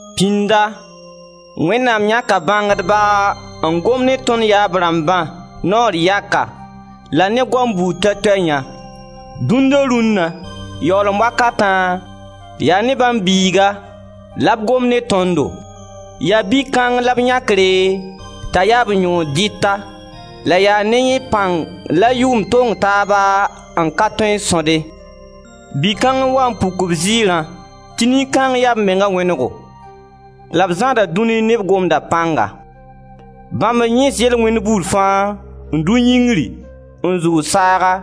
Pĩnda Wẽnnaam yãka bãngdba n gom ne tõnd yaab rãmbã naoor yaka la ne goam buud toɛ-toɛ yã, dũnna-rũnna, yaoolem wakatã, yaa ne bãmb Biiga la b gom ne tõndo. Yaa Bi-kãng la b yãkre t'a yaa b yõod dɩta la yaa ne yẽ pãng la yʋʋma tong taaba n ka tõe n sõde. Bi-kãng n waa n puk b ziirã tɩ nin-kãng yaa b menga wẽnego, la b zãada dũnia ne b Gomda pãnga. Bãmb n yẽes yel-wẽnd buud fãa, n dʋ yĩngri n zʋʋg saaga,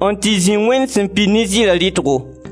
n tɩ zĩ Wẽnd sẽn pid ne ziira rɩtgo.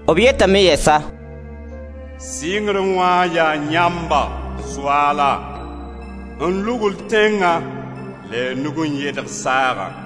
B yetame yɛsa: «Sɩngrẽ wã yaa yãmba, Soaala, n lugl tẽngã la y nug n yɛdg saagã.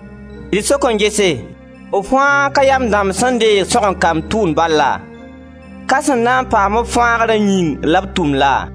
D sok n gese, b fãa ka yam dãmb sẽn deeg sõgen-kamb tʋʋmd bal laa? Ka sẽn na n paam-b fãagra yĩng la b tʋmd laa?